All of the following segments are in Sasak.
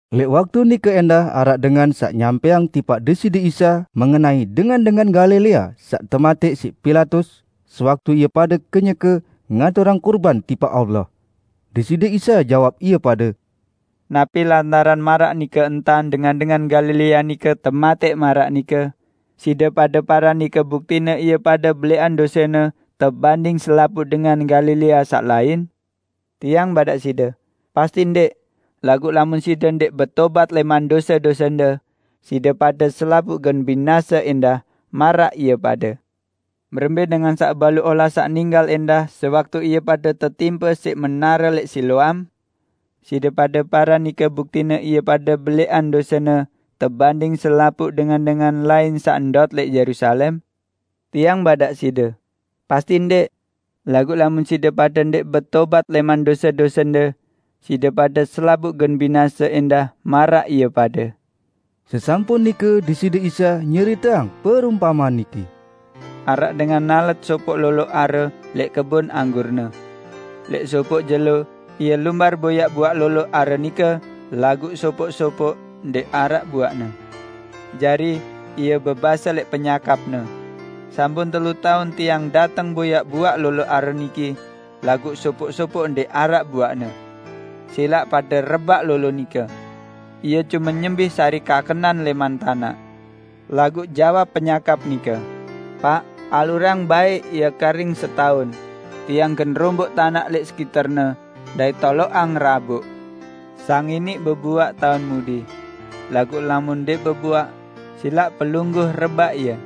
Lẽq waktu nike ẽndah araq dengan saq nyampẽang tipaq Deside Isa mengenai dengan-dengan Galilea saq tematẽq siq Pilatus, sewaktu ie pade kenyeke ngaturang kurban tipaq Allah. Deside Isa jawab ie pade, "Napi lantaran maraq nike entan dengan-dengan Galilea nike tematẽq maraq nike, side pade paran nike buktine ie pade belẽqan dosene tebanding selapuq dengan Galilea saq lain? Tiang badaq side: Pasti Ndẽq! Laguq lamun side ndẽq betobat lẽman dose-dosende, side pade selapuq gen binase ẽndah, maraq ie pade. Berembẽ dengan saq baluq olas saq ninggal ẽndah sewaktu ie pade tetimpe siq menare lẽq Siloam? Side pade paran nike buktine ie pade belẽqan dosene tebanding selapuq dengan-dengan lain saq ndot lẽq Yerusalem? Tiang badaq side: Pasti ndẽq! Laguq lamun side pade ndẽq betobat lẽman dose-dosende, side pade selapuq gen binase ẽndah maraq ie pade." Sesampun nike Deside Isa nyeriteang perumpamean niki, "Araq dengan nalet sopoq lolo are lẽq kebon anggurne. Lẽq sopoq jelo, ie lumbar boyaq buaq lolo are nike, laguq sopoq-sopoq ndẽq araq buaqne. Jari, ie bebase lẽq penyakapne, 'Sampun telu taun tiang dateng boyaq buaq lolo are niki, laguq sopoq-sopoq ndẽq araq buaqne. Silaq pade rebaq lolo nike! Ie cume nyembih sari kakenan lẽman tanaq!' Laguq jawab penyakap nike, 'Paq, alurang baẽ ie karing setaun. Tiang gen romboq tanaq lẽq sekiterne dait toloqang raboq. Sang iniq bebuaq taun mudi. Laguq lamun ndẽq bebuaq, silaq pelungguh rebaq ie.' "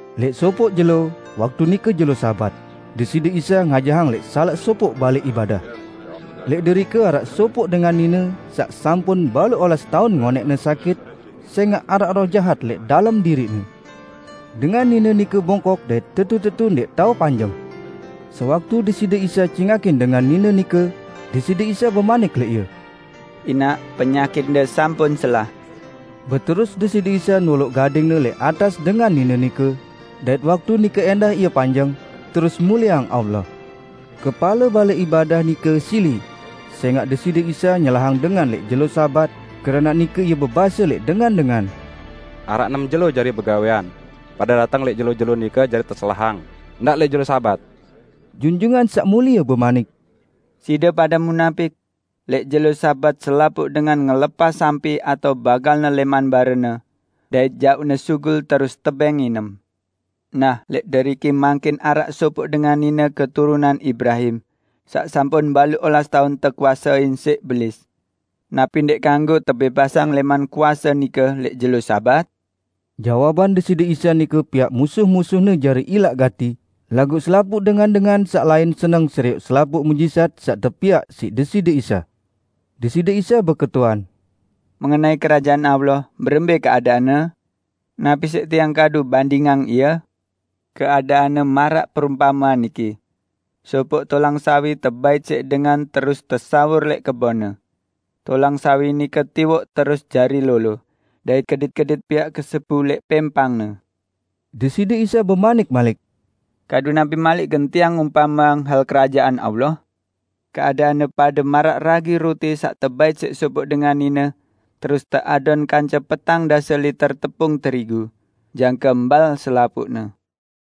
Lẽq sopoq jelo, waktu nike jelo Sabat, Deside Isa ngajahang lẽq salaq sopoq balẽ ibadah. Lẽq derike araq sopoq dengan nine saq sampun baluq olas taun ngonẽqne sakit, sẽngaq araq roh jahat lẽq dalem diriqne. Dengan nine nike bongkok dait tetu-tetu ndẽq tao panjeng. Sewaktu Deside Isa cingakin dengan nine nike, Deside Isa bemanik lẽq ie, "Inaq, penyakitde sampun selah!" Beterus Deside Isa noloq gading-Ne lẽq atas dengan nine nike, dait waktu nike ẽndah ie panjeng, terus mulieang Allah. Kepale balẽ ibadah nike sili, sẽngaq Deside Isa nyelahang dengan lẽq jelo Sabat, keranaq nike ie bebase lẽq dengan-dengan, "Araq enem jelo jari begawẽan, pade dateng lẽq jelo-jelo nike jari teselahang, ndaq lẽq jelo Sabat!" Junjungan Saq Mulie bemanik, "Side pade munapik! Lẽq jelo Sabat selapuq dengan ngelepas sampi atao bagalne lẽman barene, dait jauqne sugul terus tebẽng nginem. Nah, lẽq deriki mangkin araq sopoq dengan nine keturunan Ibrahim, saq sampun baluq olas taun tekuasein siq Belis. Napi ndẽq kanggo tebẽbasang lẽman kuase nike lẽq jelo Sabat?" Jawaban Deside Isa nike piaq musuh-musuh-Ne jari ilaq gati; laguq selapuq dengan-dengan saq lain seneng serioq selapuq muqjizat saq tepiaq siq Deside Isa. Deside Isa beketuan, "Mengenai Kerajaan Allah berembẽ keadaanne? Napi siq Tiang kadu bandingang ie? Keadaanne maraq perumpamean niki. Sopoq tolang sawi tebait siq dengan terus tesawur lẽq kebonne. Tolang sawi nike tiwoq terus jari lolo, dait kedit-kedit piaq kesebu lẽq pẽmpangne." Deside Isa bemanik malik, "Kadu napi malik gen Tiang umpameang hal Kerajaan Allah? Keadaanne pade maraq ragi ruti saq tebait siq sopoq dengan nine terus teadon kance petang dase liter tepung terigu, jangke mbal selapuqne."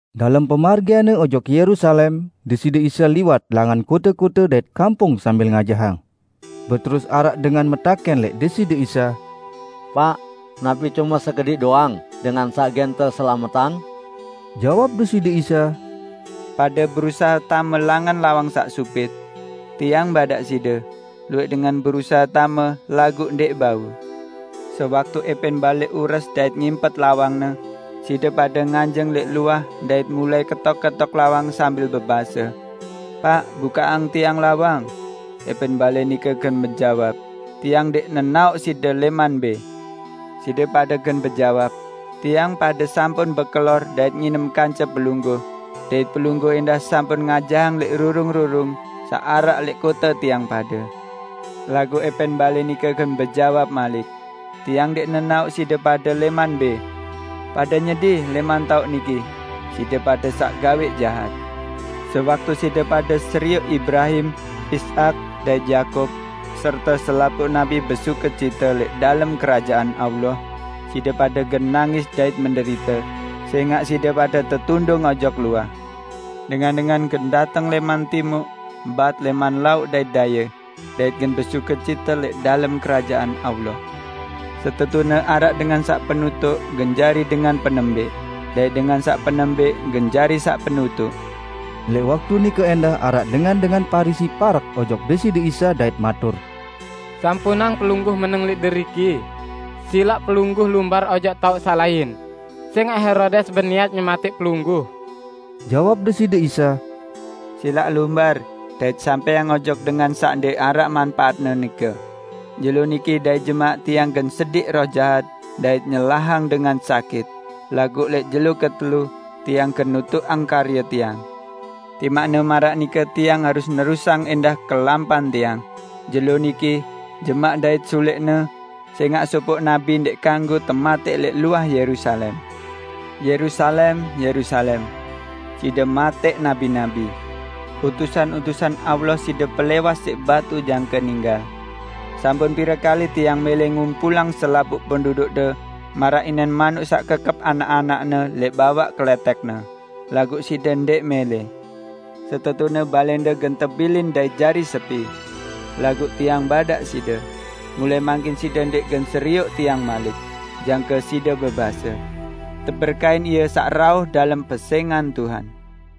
Dalem pemargian-Ne ojok Yerusalem, Deside Isa liwat langan kote-kote dait kampung sambil ngajahang. Beterus araq dengan metakẽn lẽq Deside Isa, "Paq, napi cume sekediq doang dengan saq gen teselametang?" Jawab Deside Isa, "Pade berusahe tame langan lawang saq supit. Tiang badaq side, luwẽq dengan berusahe tame laguq ndẽq bau. Sewaktu ẽpẽn balẽ ures dait ngimpet lawangne, side pade nganjeng lẽq luah dait mulai ketok-ketok lawang sambil bebase, 'Paq, bukaqang tiang lawang!' ~Epẽn balẽ nike gen bejawab, 'Tiang ndẽq nenaoq side lẽman mbẽ!' Side pade gen bejawab, 'Tiang pade sampun bekelor dait nginem kance Pelungguh, dait Pelungguh ẽndah sampun ngajahang lẽq rurung-rurung saq araq lẽq kote tiang pade!' Laguq ẽpẽn balẽ nike gen bejawab malik, 'Tiang ndẽq nenaoq side pade lẽman mbẽ! Pade nyedi lẽman taoq niki, side pade saq gawẽq jahat!' Sewaktu side pade serioq Ibrahim, Ishak dait Yakub serte selapuq nabi besukecite lẽq dalem Kerajaan Allah, side pade gen nangis dait menderite, sẽngaq side pade tetundung ojok luah! Dengan-dengan gen dateng lẽman Timuq, Bat, lẽman Lauq dait Daye, dait gen besukecite lẽq dalem Kerajaan Allah. Setetune, araq dengan saq penutuq gen jari dengan penembẽq, dait dengan saq penembẽq gen jari saq penutuq." Lẽq waktu nike ẽndah araq dengan-dengan Parisi parek ojok Deside Isa dait matur, "Sampunang Pelungguh meneng lẽq deriki, silaq Pelungguh lumbar ojok taoq saq lain, sẽngaq Herodes beniat nyematẽq Pelungguh." Jawab Deside Isa, "Silaq lumbar dait sampẽang ojok dengan saq ndẽq araq manpaatne nike, 'Jelo niki dait jemaq Tiang gen sediq roh jahat dait nyelahang dengan sakit, laguq lẽq jelo ketelu, Tiang gen nutuqang karye Tiang.' Timaqne maraq nike Tiang harus nerusang ẽndah kelampan Tiang, jelo niki, jemaq dait sulẽqne, sẽngaq sopoq nabi ndẽq kanggo tematẽq lẽq luah Yerusalem. Yerusalem, Yerusalem! Side matẽq nabi-nabi! Utusan-utusan Allah side pelẽwas siq batu jangke ninggal! Sampun pire kali Tiang mẽlẽ ngumpulang selapuq pendudukde maraq inen manuk saq kekep anak-anakne lẽq bawaq kelẽtẽkne, laguq side ndẽq mẽlẽ! Setetune balẽnde gen tebilin dait jari sepi. Laguq Tiang badaq side: Mulai mangkin side ndẽq gen serioq Tiang malik, jangke side bebase, 'Teberkahin Ie saq rauh dalem pesẽngan Tuhan.' "